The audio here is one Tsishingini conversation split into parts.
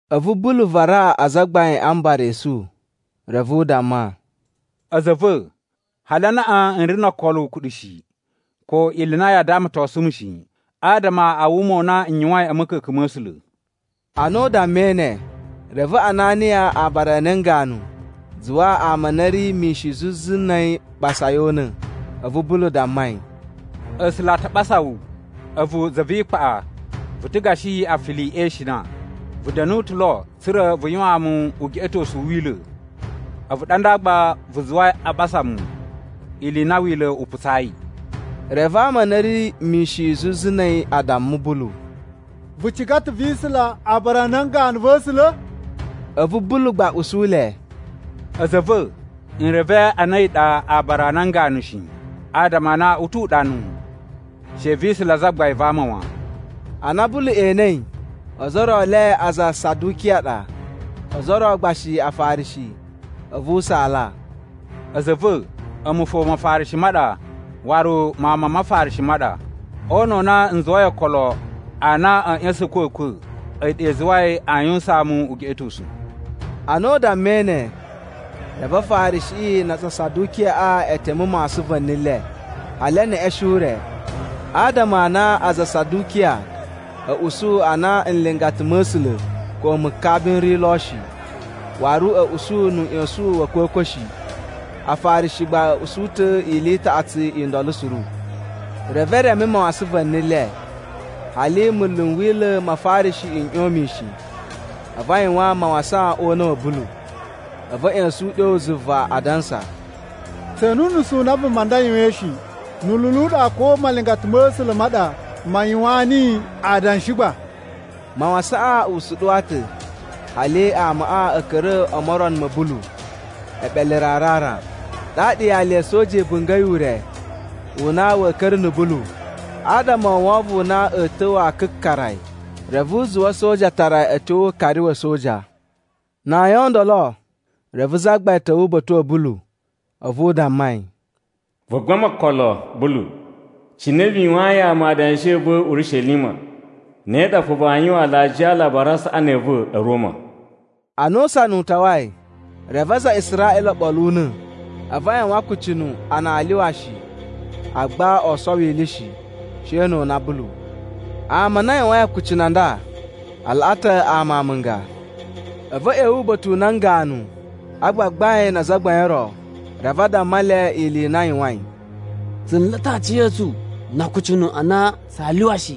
A̱vu Bulu varaa Azagbain a Mbara esu, reve u damma, “A̱za̱ a̱ va̱, hali anaꞌan n ri no okolo ukuɗu shi, ko ili i na yaa damatosun mu shi, adama a wuma u na n yuwain a̱ ma̱ka̱ka̱n ma̱ A̱sula̱.” Ana u dammai ne, reve Ananiya aabara a nan ganu zuwa ama a na a̱ ri mishin zuzu na̱ a̱yi ɓasa yi o una̱. A̱vu Bulu damma yi, “A̱sula̱ a ta ɓasa wu, a̱vu za vi ikpaꞌa vu ta̱ gashi afili e ishina! Vu da̱nu ta̱ lo, tsa̱ra̱ vu yuwaan mu ugeꞌetosu u Wila̱, a̱vu ɗa nda gba vu zuwai a ɓasa mu, ili i na Wila̱ u putsayi.” Reve ama a na a̱ ri mishin zuzu na̱ a̱yi a damma Bulu, “Vu ciga ta̱ vi isula aabara a nan ganu va̱ A̱sula̱?” A̱vu Bulu gba u usu le, “A̱za̱ a̱ va̱, n reve a na a̱yi ɗa aabara a nan ganu shi. Adama a na u tu uɗanu, ‘She vi isula zagbain va ama wan.’” Ana Bulu enei ozo o ro e le aza a Sadukiya a ɗa, ozo o ro gba shi Afarishi, a̱vu u saala, “A̱za̱ a̱ va̱, a̱mu fo Mafarishi ma ɗa waru mawun ma Mafarishi ma ɗa. O una̱ u na n zuwai okolo a na a̱a̱ ꞌya̱sa̱n a̱kwa̱kwa̱ a̱yi ɗa i zuwai aa yuwusaan mu ugeꞌetosu.” Ana u dammai ne, reve Afarishiꞌi na aza a Sadukiyaꞌa e teme mawasan va̱ni le, hali e neꞌeshen ure. Adama a na aza a Sadukiya a̱ usu a na nlingata ma̱ A̱sula̱ ko mukabi n ri lo shi, waru a̱ usu nu uꞌyosun wa̱ a̱kwa̱kwa̱ shi. Afarishi gba a̱ usu ta̱ ili i taꞌatsu i ndolo suru. Reve e reme mawasan va̱ni le, hali munlu n Wila̱ ma Afarishi n ꞌyon mishin a̱vu a yuwan mawasan o una̱ wa̱ Bulu. A̱vu a̱ ꞌya̱sa̱n uɗyo zuva, adansa, “Tse ene unusu u na vuma nda yuwain shi. Nu ululu u ɗa ko malingata ma̱ A̱sula̱ ma ɗa ma yuwaan niyi adanshi gba?” Mawasaꞌan u suɗuwa ta̱ hali amaꞌa a̱ ka̱ra̱ o morono ma̱ Bulu eɓele ra ra ra. Ɗaɗa yali ya̱ a̱soja i bunga̱i ure u na wa̱a̱ ka̱ra̱ na̱ Bulu adama o wovon u na a̱ ta̱wa̱ a kakara yi. Reve u zuwa a̱soja a tara yi a̱ tyo o ukari wa̱ a̱soja. Na ayin o ndolo, reve Zagbain ta̱wa̱ uba̱ta̱ wa̱ Bulu a̱vu u damma yi, “Vu gbama okolo, Bulu. Cine vu yuwayin ama adanshi a̱ va̱ Urishelima, ne ɗa fo vaa yuwan alajiya a Alabari a Saꞌani a̱ va̱ a̱ Roma.” Ana usana u tawai, reve aza a Israꞌila o ɓolo una̱, a̱vu a yuwan akucunu a na aa lyuwa shi, agba oo sowo ili shi, she no o una Bulu. Ama a na a yuwain akucunu a nda a laꞌa ta̱ ama amunga. A̱vu a̱ ꞌya̱wa̱ uba̱ta̱ u nan ganu a gbagbain na azagbain o ro, reve a damma le ili i na a yuwain. “Tsu nla̱ ta̱ aciya̱tsu na akucunu a na tsaa lyuwa shi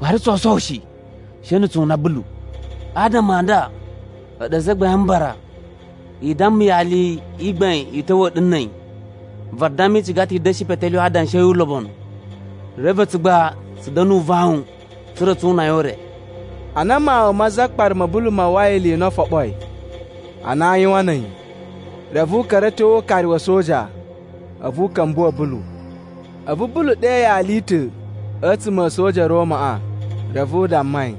waru tsoo sowo shi, she na̱ tsu una Bulu. Adama a nda, a̱ɗu Azagbain a Mbara i damma yali i gbain u ta̱wa̱a̱ ɗu na̱ a̱yi, vadamma i ciga ta̱ i da̱shi petelyuwe adanshi a̱ yi ulobonu. Reve a̱tsu gba tsu da̱na̱ uvawun tsa̱ra̱ tsu una yi o ure.” Ana mawun ma zakpara ma̱ Bulu ma uwwai ili i na o foɓoi a na aa yuwan na̱ a̱yi, reve u ka̱ra̱ a̱ tyo o ukari wa̱ a̱soja a̱vu u ka̱mbuwa̱ Bulu. A̱vu Bulu ɗe yali i ta̱ a̱tsuma̱ a̱ a̱soja a̱ Romaꞌa. Reve u damma yi,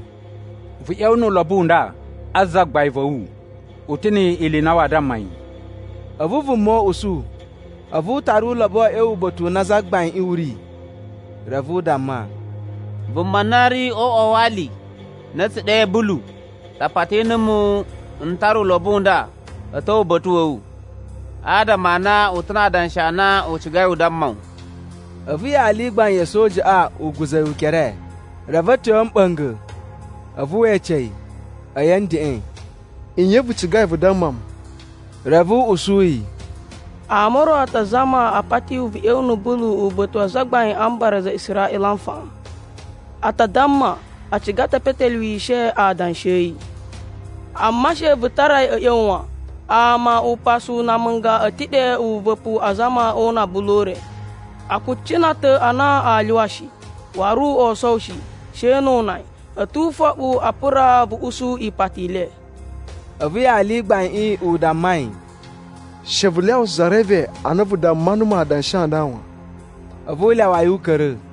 “Vu ꞌya̱wa̱ nu ulobo u nda a zagbain va̱ wu, u ta̱ ni ili i na waa damma yi.” A̱vu vuma u usu, a̱vu u tara uloboꞌo a̱ ꞌya̱wa̱ uba̱ta̱ u na zagbaiꞌin u ri. Reve u damma, “Vuma na ri o uꞌwa wa ali na a̱ tsu ɗe Bulu ɗa pati numu n tara ulobo u nda a̱ ta̱wa̱ uba̱ta̱ wa̱ wu, adama a na u ta̱ na adanshi a na u cigai u damma wu.” A̱vu yali i gbain ya̱ a̱sojaꞌa u guza̱ yi ukere, reve a̱ tyo a̱ mɓa̱nga̱, a̱vu we ece yi, a̱yi a̱ ndeꞌen, “Nye vu cigai vu damma mu?” Reve u usu yi, “Ama o ro a ta zama a pati wu vu ꞌya̱wa̱ na̱ Bulu uba̱ta̱ wa Azagbain a Mbara a aza a Israꞌila nfaꞌan. A ta damma a ciga ta̱ e petelyuwishe adanshi a̱ yi. Amma she vu tara yi a̱ ꞌya̱wa̱ wan! Ama upasu na amunga a̱ ta̱ ɗe uva̱pu azama o una Bulu o ure. A kucina ta̱ a na aa lyuwa shi, waru oo sowo shi, she no o una yi. A̱ tu ufoɓu a pura vu usu ipati i le.” A̱vu yali i gbaiꞌin u damma yi, “She vu lyawa za reve a na vu damma numu adanshi a nda wan.” A̱vu u lyawa yi u ka̱ra̱.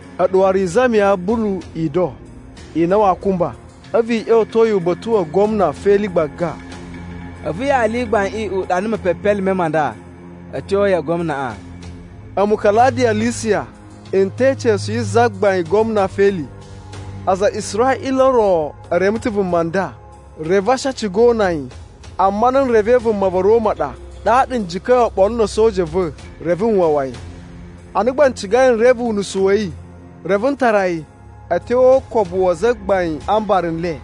A̱ɗu waru i zamiya Bulu ido i na waa kumba. A̱vu i ꞌya̱wa̱to yi uba̱ta̱ wa gwamna Feli gbaga.” A̱vu yali i gbaiꞌin u ɗana mepepelime ma nda a̱ tyo ya gwamnaꞌa: “A̱mu Kaladiya Lisiya n te ica̱su yi zagbain gwamna Feli: “Aza a Israꞌila o ro e reme ta̱ vuma nda, reve a̱ shi a ciga o una yi. Amma ana n revei vuma va̱ Roma ɗa, ɗaɗa n jika̱i oɓolo na̱ a̱soja a̱ va̱ reve n wawa yi. Ana gba n cigai n reve unusu wa̱ yi, reve n tara yi a̱ tyo o ukobu wa Azagbain a Mbara n le.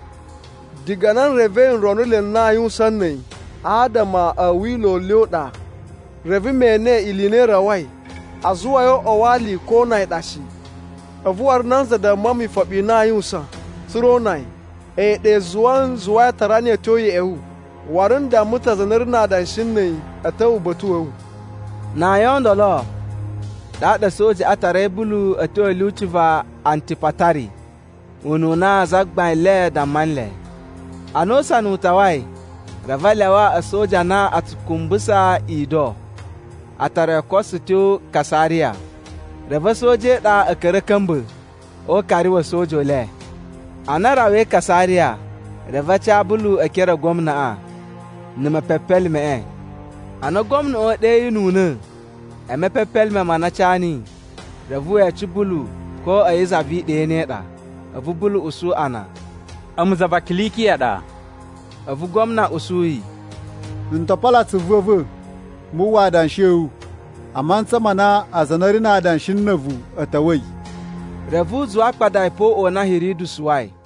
Diga na n revei nronuloi n na aa yuwusan na̱ a̱yi adama a̱ Wila̱ u le ɗa. Reve me ene ili i na i rawai a zuwa yi o uꞌwa wa ali ko o una yi ɗa shi. A̱vu waru nanza damma mu ifoɓi i na aa yuwusan, tsa̱ra̱ o una yi, a̱yi ɗa i zuwai n zuwai a tara niyi a̱ tyo ya̱ꞌa̱ wu. Waru n damma ta̱ aza a na a̱ ri na adanshi na̱ a̱yi a̱ ta̱wa̱ uba̱ta̱ wa̱ wu.” Na ayin o ndolo, ɗaɗa a̱sojaꞌa a tarai Bulu a̱ tyo a̱ lyuci va Antipatari ununa zagbain le damma nle. Ana usana u tawai, reve a lyawa a̱soja a na a tsu kumbusa ido a tara yi o koso tyo Kasariya. Reve a̱soja e iɗa a̱ ka̱ra̱ a̱ ka̱mba̱ o ukari wa̱ a̱soja u le. Ana a rawai Kasariya, reve a ca Bulu e ekere a gwamnaꞌa na̱ mepepelimeꞌe. Ana gwamnaꞌa u ɗeyinuna̱ e mepepelime ma na a ca niyi, reve we ece Bulu ko a̱yi za vi iɗa i ne i ɗa. A̱vu Bulu usu a na, “A̱mu za va Kilikiya ɗa.” A̱vu gwamna u usu yi, “N to polo atsuvu a̱ va̱ mu uwwa adanshi a̱ wu, a mantsa ma na aza a na a̱ ri na adanshi na̱ a̱vu, a̱ ta̱wa̱i.” Reve u zuwa a kpada yi pe o uꞌwa u na Hiridu suwai.